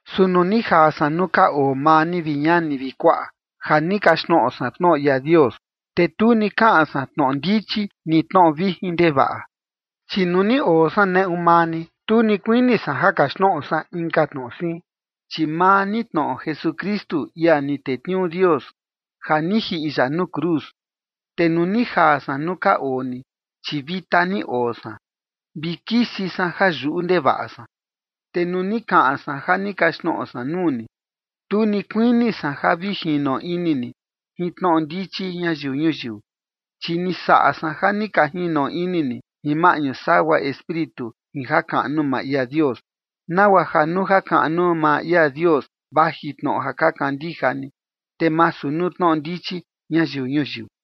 Su nuu ni jaa san nuu ka oo maa ni, vi ñani vi kuaꞌa, ja ni kaxtnoꞌo san tnoꞌo ia Dios, te tu ni kaꞌan san tnoꞌo ndichi ni tnoꞌo vijin ndevaꞌa. Chi nuu ni oo san neꞌu maa ni, tu ni kuini san ja kaxtnoꞌo san inka tnoꞌo siin, chi maa ni tnoꞌo Jesukristu, ia ni tetniuu Dios, ja ni jiꞌi ya nuu cruz. Te nuu ni jaa san nuu ka oo ni, chi vita ni oo san, vi kisi san ja yuꞌu ndevaꞌa san. Te nuu ni kaꞌan san ja ni kaxtnoꞌo san nuu ni, tu ni kuini san ja vi jino ini ni jin tnoꞌo ndichi ñayiu ñuyiu. Chi ni saꞌa san ja ni ka jino ini ni jin maꞌñu sagua Espíritu jin jakaꞌnu maa ia Dios, nagua ja nuu jakaꞌnu maa ia Dios vaji tnoꞌo ja ka kandija ni, te masu nuu tnoꞌo ndichi ñayiu ñuyiu.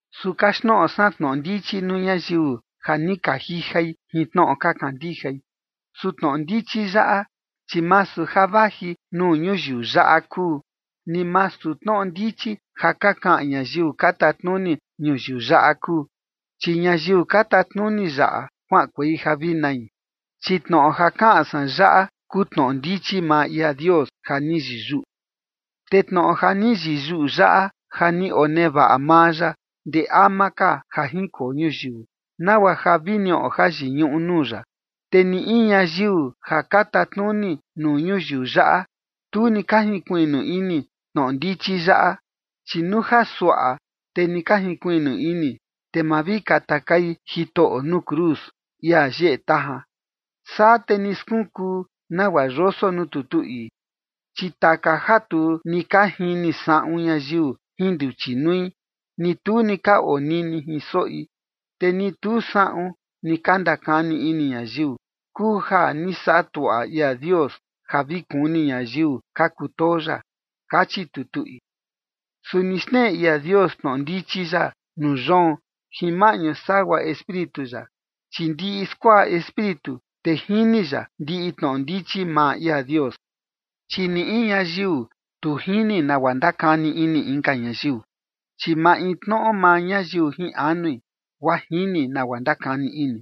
Su kaxtnoꞌo san tnoꞌo ndichi nuu ñayiu ja ni ka jijai jin tnoꞌo ka kandijai. Su tnoꞌo ndichi yaꞌa, chi masu ja vaji nuu ñuyiu yaꞌa kuu, ni masu tnoꞌo ndichi ja ka kaꞌan ñayiu ka tatnuni ñuyiu yaꞌa kuu, chi ñayiu ka tatnuni yaꞌa kuaꞌankuei ja vi nai. Chi tnoꞌo ja kaꞌan san yaꞌa kuu tnoꞌo ndichi maa ia Dios ja ni yiyuꞌu. Te tnoꞌo ja ni yiyuꞌu yaꞌa, ja ni onevaꞌa maa ya ndee ama ka ja jinkoo ñuyiu, nagua ja vi niꞌo jayiñuꞌu nuu ya. Te ni in ñayiu ja ka tatnuni nuu ñuyiu yaꞌa, tu ni ka jinkuiꞌnu ini tnoꞌo ndichi yaꞌa, chi nuu ja suaꞌa, te ni ka jinkuiꞌnu ini, te ma vi katakai Jitoꞌo nuu cruz, ia yeꞌe tajan. Saa te ni skunkuu nagua yoso nuu tutu ii: Chi taka ja tu ni ka jini saꞌun ñayiu jin nduchi nui, ni tu ni ka onini jin soꞌi, te ni tu saꞌun ni ka ndakani ini ñayiu, kuu ja ni saꞌa tuaꞌa ia Dios ja vi kuni ñayiu ka kutoo ya, kachi tutu ii. Su ni xneꞌe ia Dios tnoꞌo ndichi yaꞌa nuu yoon jin maꞌñu sagua Espíritu ya, chi ndiꞌi skuaꞌa Espíritu, te jini ya ndiꞌi tnoꞌo ndichi maa ia Dios. Chi ni in ñayiu tu jini nagua ndakani ini inka ñayiu, chi maintnoꞌo maa ñayiu jin anui, guaa jini nagua ndakani ini.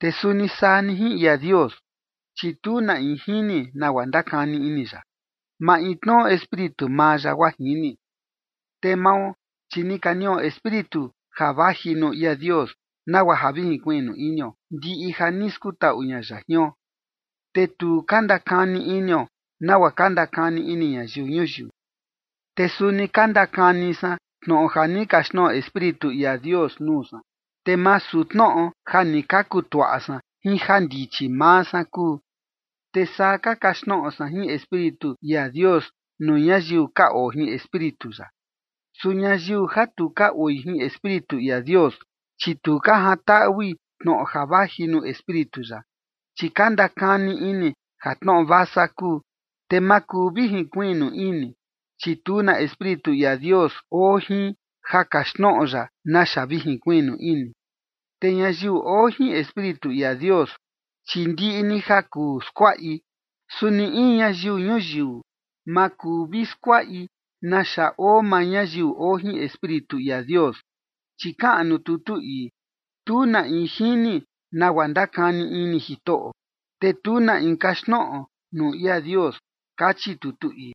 Te suni saa ni jin ia Dios, chi tu na in jini nagua ndakani ini ya, maintnoꞌo Espíritu maa ya guaa jini. Te mao, chi ni ka niꞌo Espíritu ja vaji nuu ia Dios, nagua ja vi jinkuiꞌnu inio ndiꞌi ja ni skutaꞌu ña ya jion, te tu ka ndakani inio nagua ka ndakani ini ñayiu ñuyiu. Te suni ka ndakani san tnoꞌo ja ni kaxtnoꞌo Espíritu ia Dios nuu san, te masu tnoꞌo ja ni ka kutuaꞌa san jin jandichi maa san kuu. Te saa ka kaxtnoꞌo san jin Espíritu ia Dios nuu ñayiu ka oo jin Espíritu ya. Su ñayiu ja tu ka oi jin Espíritu ia Dios, chi tu ka jantaꞌui tnoꞌo ja vaji nuu Espíritu ya, chi ka ndakani ini ja tnoꞌo vasa kuu. Te ma kuu vi jinkuiꞌnu ini, chi tu na Espíritu ia Dios oo jin ja kaxtnoꞌo ya naxa vi jinkuiꞌnu ini. Te ñayiu oo jin Espíritu ia Dios, chi ndiꞌi ni ja kuu skuaꞌi, su ni in ñayiu ñuyiu ma kuu vi skuaꞌi naxa oo maa ñayiu oo jin Espíritu ia Dios. Chi kaꞌan nuu tutu ii: “Tu na in jini nagua ndakani ini Jitoꞌo, te tu na in kaxtnoꞌo nuu ia Dios” kachi tutu ii.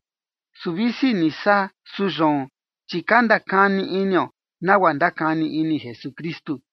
Su visi ni saa, su yoon, chi ka ndakani inio nagua ndakani ini Jesukristu.